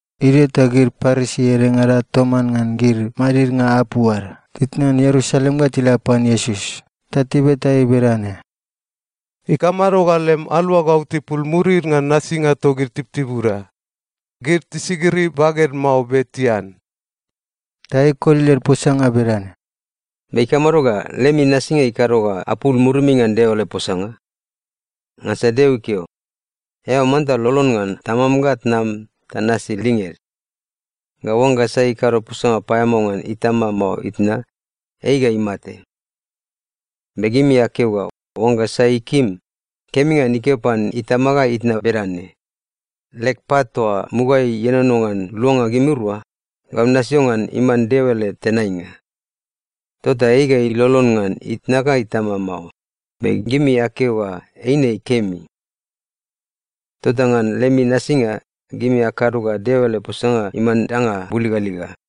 Idio ta gid Parisi edengada toman ngan gid madidnga apu ad titnan Ierusalem ga tila pan Iesus ta tibeta ei bedane, “Ikamado ga lem aluagau tipul murid ngan nasinga togid tibutibuda? Gid tisigiri baged mao be tian.” Ta ei ikoli led posanga bedane, “Be ikamado ga lemi nasinga ikado ga apul murimi ngan Deo ele posanga? Ngansa Deo ikeo, ‘Eao manta lolon ngan tamam ga tnam ta nasi linged.’ Ga ‘Oangga sai kado posanga paeamao ngan itama mao itna, ei ga imate.’ Be gimi akeo ga oangga sai ikim, kemi ngan ikeo pan itama ga itna bedane, ‘Leg pat toa mugaeai ienono ngan luanga gimirua, gau nasio ngan iman Deo ele tenainga.’ Tota ei ga ilolon ngan itna ga itama mao, be gimi akeo ga eine kemi. Tota ngan lemi nasinga, gimi akado ga Deo ele posanga iman danga buligaliga.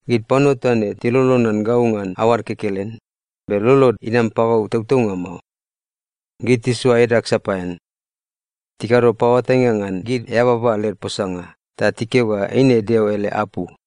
“‘Gid panua toa ne tilolon ngan gau ngan aoad kekelen, be lolod inam pagau tautaunga mao. Gid tisoa edag sapaean. Tikado paoatainga ngan gid eababa led posanga ta tikeo ga eine Deo ele apu.’”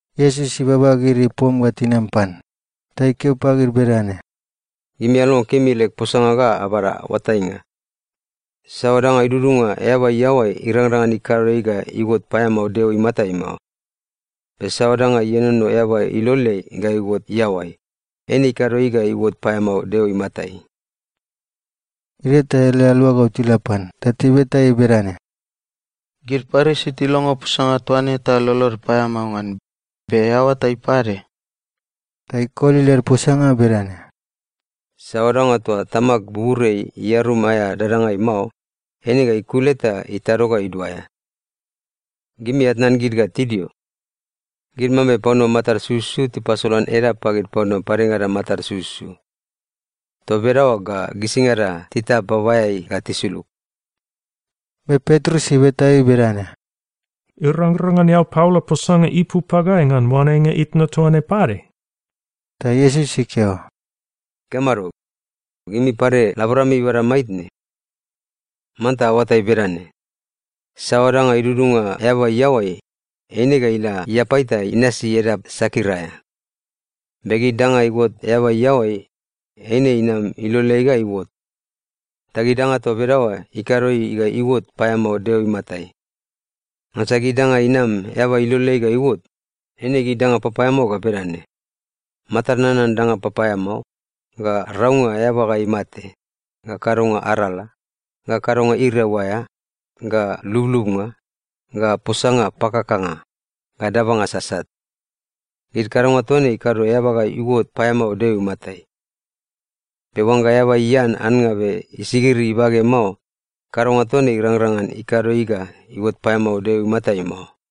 Iesus ibaba gid ipom ga tinam pan ta ikeo pagid bedane, “Gimi alongo kemi leg posanga ga abada oatainga. Saoa danga idudunga eaba iaoai irangrang ngan ikado ei ga iuot paeamao Deo imatai mao. Be saoa danga ienono eaba iloleai ga iuot iaoai, eine ikado ei ga iuot paeamao Deo imatai.” Idio ta ele aluagau tila pan ta tibeta ei bedane, “Gid Parisi tilongo posanga toa ne ta lolod paeamao ngan, be eao oatai pade?” Ta ikoli led posanga bedane, “Saoa danga toa Tamag buburiai iarum aea dadangai mao, eine ga ikule ta itado ga iduaea. Gimi atnan gid ga tidio. Gid mambe panua matad sususu tipasolan edap pagid panua padengada matad sususu. Toa bedaoa ga gisingada titap babaeai ga tisulug.” Be Petrus ibeta ei bedane, “Irangrang ngan eao paola posanga ipu pagai ngan oanenga itna toa ne pade?” Ta Iesus ikeo, “Ikamado? Gimi pade laborami ibada maitne? Manta aoatai bedane: Saoa danga idudunga eaba iaoai, eine ga ila iapai ta inasi edap sakir aea. Be gid danga iuot eaba iaoai, eine inam iloleai ga iuot. Ta gid danga toa bedaoa ikado ei ga iuot paeamao Deo imatai. Ngansa gid danga inam eaba iloleai ga iuot, eine gid danga papaeamao ga bedane: matad nanan danga papaeamao, ga raunga eaba ga imate, ga kadonga arala, ga kadonga iriau aea, ga lublubnga, ga posanga pakakanga, ga dabanga sasat. Gid kadonga toa ne ikado eaba ga iuot paeamao Deo imatai. Be oangga eaba ian annga be isigiri ibage mao, kadonga toa ne irangrang ngan ikado ei ga iuot paeamao Deo imatai mao.”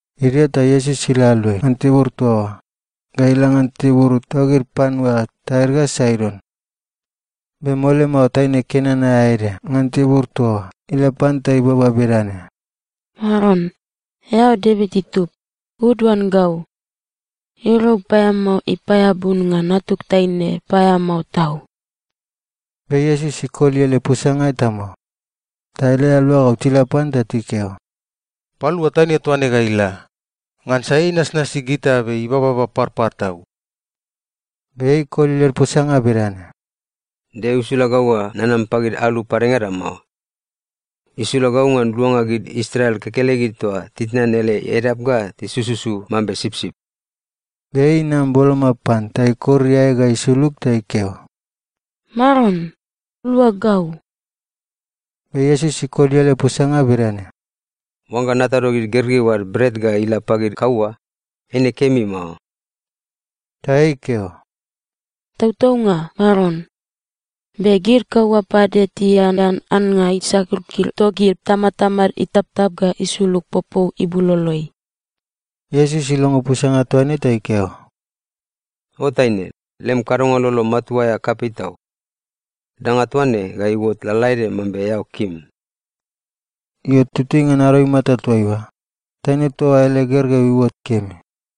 Idio ta Iesus ila aluai ngan tibur toa oa ga ila ngan tibur togid panua Tair ga Saidon. Be mole mao taine Kenan aea ede ngan tibur toa oa ila pan ta ibaba bedane, “Maron, eao Devit itub, uduan gau! Iriau paeamao ipaeabu ngan natug taine paeamao tau.” Be Iesus ikoli ele posanga eta mao. Ta ele aluagau tila pan ta tikeo, “Palua taine toa ne ga ila, ngansa ei inasnasi gita be ibababa parpar tau.” Be ei ikoli led posanga bedane, “Deo isula gau ga nanam pagid alu padengada mao. Isula gau ngan luanga gid Israel kekelegid toa titnan ele edap ga tisususu mambe sipsip.” Be ei inam boloma pan ta ikor iae ga isulug ta ikeo, “Maron, lua gau!” Be Iesus ikoli ele posanga bedane, “Oangga natado gid gergeu ad bret ga ila pagid kaua, eine kemi mao.” Ta ei ikeo, “Tautaunga, Maron. Be gid kaua pade tianean annga isakirkir togid tamatamad itaptap ga isulug popou ibuloloeai.” Iesus ilongo posanga toa ne ta ikeo, “O taine, lem kadonga lolo matua aea kapei tau. Danga toa ne ga iuot lalaede mambe eao kim.” Io, tutui ngan ado imata toaiua, taine toa oa ele gergeu iuot kemi.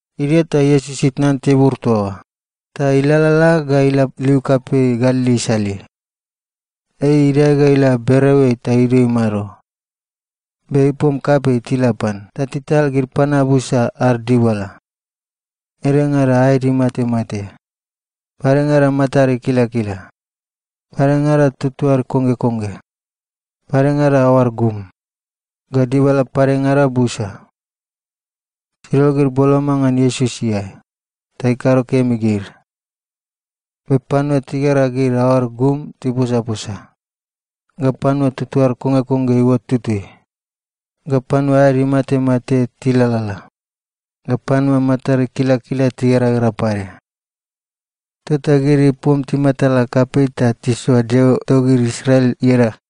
Idio ta Iesus itnan tibur toa oa ta ilalala ga ila liu kapei Galili isaleai. Ei idae ga ila bereoeai ta idio imado. Be ipom kapei tila pan ta tital gid panua busa ad dibala. Edengada aed imatemate, padengada matad ikilakila, padengada tuatuad konggekongge, padengada aoad gum, ga dibala padengada busa. Tidol gid boloma ngan Iesus iae, ta ikado kemi gid. Be panua tigera gid aoad gum tiposaposa, ga panua tuatuad konggekongge iuot tutui, ga panua aed imatemate tilalala, ga panua matad ikilakila tigeragera pade. Tota gid ipom timatala kapei ta tisoa Deo togid Israel ieda.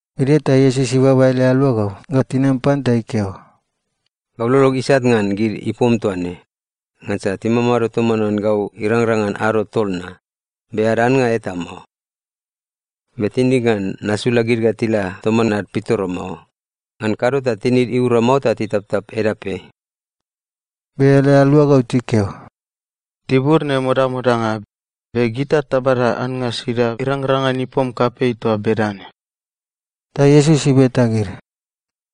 Idio ta Iesus ibaba ele aluagau ga tinam pan ta ikeo, “Gau lolog isat ngan gid ipom toa ne, ngansa timamado toman ngan gau irangrang ngan ado tol na, be ad annga eta mao. Be tinig ngan nasula gid ga tila toman ad pitoro mao. Ngan kado ta tinid iura mao ta titaptap edapeai.” Be ele aluagau tikeo, “Tibur ne modamodanga. Be gita tabada annga sida irangrang ngan ipom kapei toa bedane?” Ta Iesus ibeta gid,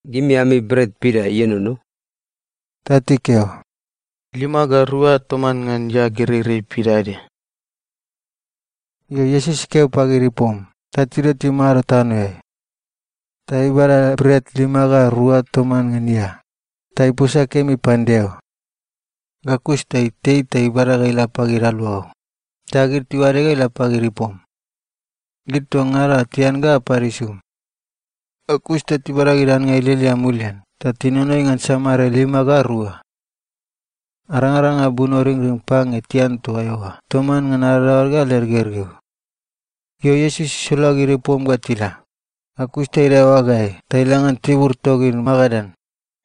“Gimi ami bret pida ienono?” Ta tikeo, “Lima ga rua toman ngan ia gereirei pidaede.” Io, Iesus ikeo pagid ipom ta tidio timado tanoeai. Ta ibada bret lima ga rua toman ngan ia, ta iposa kemi pan Deo. Ga kus ta itei ta ibada ga ila pagid aluagau, ta gid tiuade ga ila pagid ipom. Gid toa ngada oa tian ga apad isum. Ga kus ta tibada gid annga ilialia mulian ta tinonoi ngan samare lima ga rua. Arangaranga bunoringring pange tian toa eoa toman ngan adadaoad ga led gergeu. Io, Iesus isula gid ipom ga tila, ga kus ta idae oagaeai ta ila ngan tibur togid Magadan.